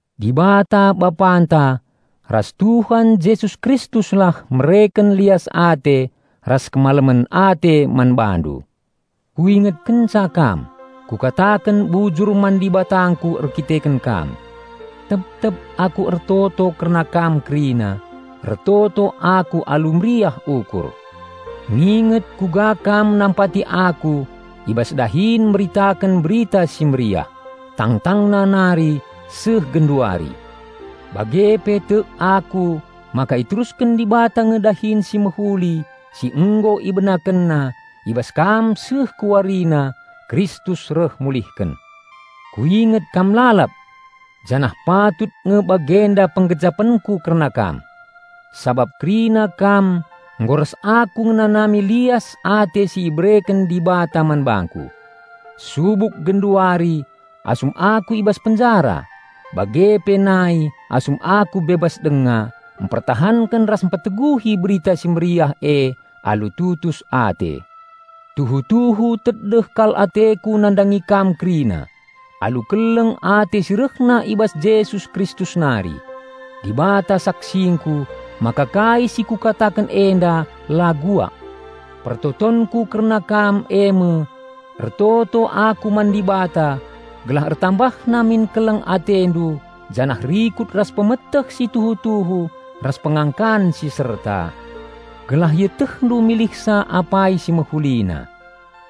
Dibata Bapanta ras Tuhan Jesus Kristuslah mereken lias ate ras kemalemen ate man bandu. Kuinget kenca kam, kukataken bujur man Dibatangku erdandanken kam. Tep-tep aku ertoto kerna kam kerina, ertoto aku alu meriah ukur. Nginget kuga kam nampati aku i bas dahin meritaken Berita Si Mehuli, tangtangna nari seh genduari. Bage pe tek aku maka iterusken Dibata nge dahin si mehuli si nggo IbenakenNa i bas kam seh ku warina Kristus reh mulihken. Kuinget kam lalap! Janah patut nge bagenda penggejapenku kerna kam. Sabap kerina kam nggo ras aku ngenanami lias ate si ibereken Dibata man bangku, subuk genduari asum aku i bas penjara, bage pe nai asum aku bebas denga mpertahanken ras mpeteguhi Berita Si Mehuli e alu tutus ate. Tuhu-tuhu tedeh kal ateku nandangi kam kerina alu keleng ate si rehna i bas Jesus Kristus nari. Dibata saksingku maka kai si kukataken enda la bual. Pertotonku kerna kam eme: Ertoto aku man Dibata gelah ertambahna min keleng atendu janah rikut ras pemeteh si tuhu-tuhu ras pengangkan si serta, gelah ietehndu milihsa apai si mehulina.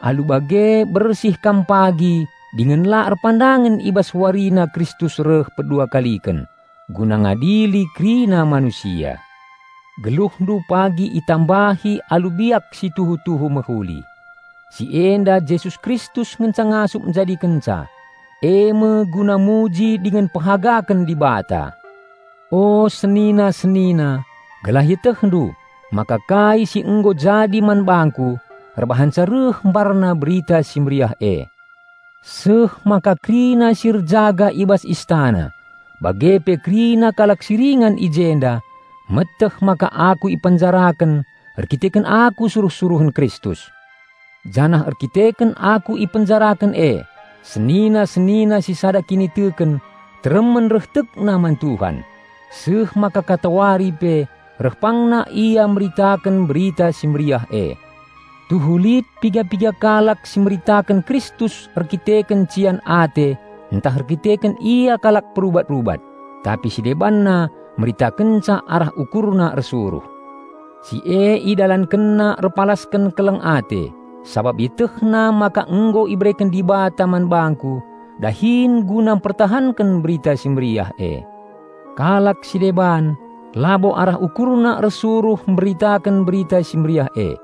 Alu bage bersih kam pagi dingen la erpandangen i bas warina Kristus reh pedua kaliken guna ngadili kerina manusia. Geluhndu pagi itambahi alu biak si tuhu-tuhu mehuli. Si enda Jesus Kristus ngenca ngasup njadikenca, eme guna muji dingen pehagaken Dibata. O senina-senina, gelah ietehndu, maka kai si nggo jadi man bangku erbahanca reh mbarna Berita Si Mehuli e. Seh maka kerina si erjaga i bas istana bage pe kerina kalak si ringan i jenda meteh maka aku ipenjaraken erdandanken aku suruh-suruhen Kristus. Janah erdandanken aku ipenjaraken e, senina-senina si sada kiniteken teremen reh tekna man Tuhan, seh maka katawari pe reh pangna ia meritaken Berita Si Mehuli e. Tuhu lit piga-piga kalak si meritaken Kristus erdandanken cian ate ntah erdandanken ia kalak perubat-rubat, tapi si debanna meritakenca arah ukurna ersuruh. Si e idalankenna erpalasken keleng ate, sabap ietehna maka nggo ibereken Dibata man bangku dahin guna mpertahanken Berita Si Mehuli e. Kalak si deban, labo arah ukurna ersuruh mberitaken Berita Si Mehuli e,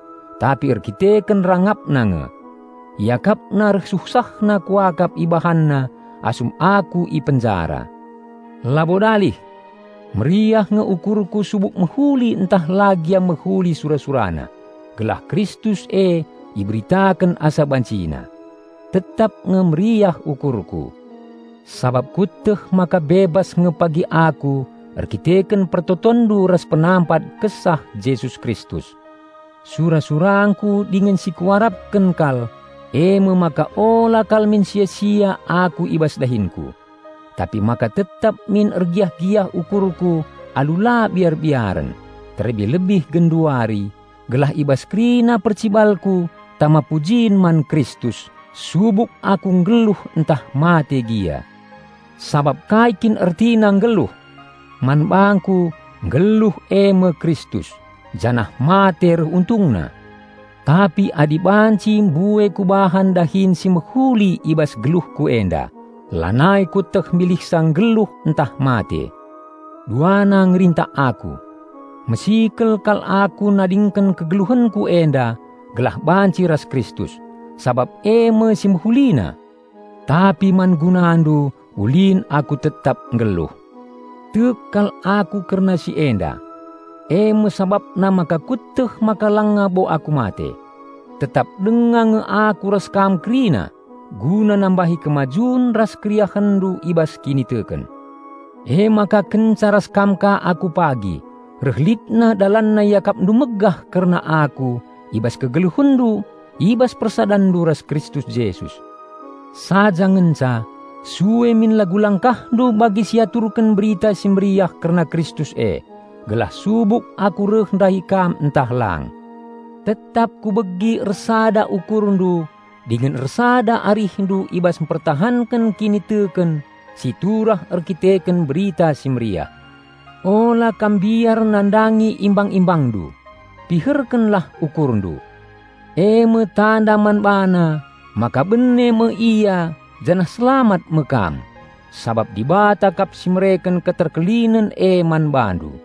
tapi erkiteken rangapna nge. Iakapna reh suhsahna kuakap ibahanna asum aku i penjara. Labo dalih! Meriah nge ukurku subuk mehuli ntah la gia mehuli sura-surana, gelah Kristus e iberitaken asa bancina. Tetap nge meriah ukurku, sabap kueteh maka bebas nge pagi aku erdandanken pertotonndu ras penampat Kesah Jesus Kristus. Sura-surangku dingen si kuarapken kal eme maka ula kal min sia-sia aku i bas dahinku, tapi maka tetap min ergiah-giah ukurku alu la biar-biaren, terlebih-lebih genduari, gelah i bas kerina percibalku tama pujin man Kristus, subuk aku nggeluh ntah mate gia. Sabap kai kin ertina nggeluh! Man bangku, nggeluh eme Kristus, janah mate reh untungna. Tapi adi banci mbue kubahan dahin si mehuli i bas geluhku enda, lanai kueteh milihsa nggeluh ntah mate. Duana ngerintak aku. Mesikel kal aku nadingken kegeluhenku enda gelah banci ras Kristus. Sabap eme si mehulina! Tapi man gunandu ulin aku tetap nggeluh. Tek kal aku kerna si enda. Eme sabapna maka kueteh maka langa bo aku mate. Tetap denga nge aku ras kam kerina guna nambahi kemajun ras keriahenndu i bas kiniteken. Emaka kenca ras kam ka aku pagi, reh litna dalanna iakapndu megah kerna aku i bas kegeluhenndu i bas persadanndu ras Kristus Jesus. Saja ngenca, sue min lagu-langkahndu bagi si iaturken Berita Si Mehuli kerna Kristus e, gelah subuk aku reh ndahi kam ntah lang, tetap kubegi ersada ukurndu dingen ersada arihndu i bas mpertahanken kiniteken si turah erdandanken Berita Si Mehuli. Ula kam mbiar nandangi imbang-imbangndu; piherkenlah ukurndu. Eme tanda man bana maka bene me ia janah selamat me kam. Sabap Dibata kap si mereken keterkelinen e man bandu.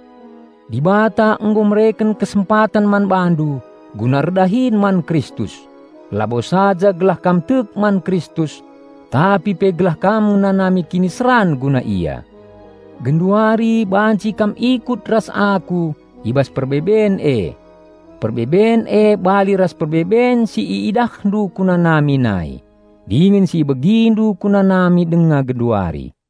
Dibata nggo mereken kesempaten man bandu guna erdahin man Kristus, labo saja gelah kam tek man Kristus, tapi pe gelah kam ngenanami kiniseran guna Ia. Genduari banci kam ikut ras aku i bas perbeben e. Perbeben e bali ras perbeben si iidahndu kunanami nai, dingen si ibegindu kunanami denga genduari.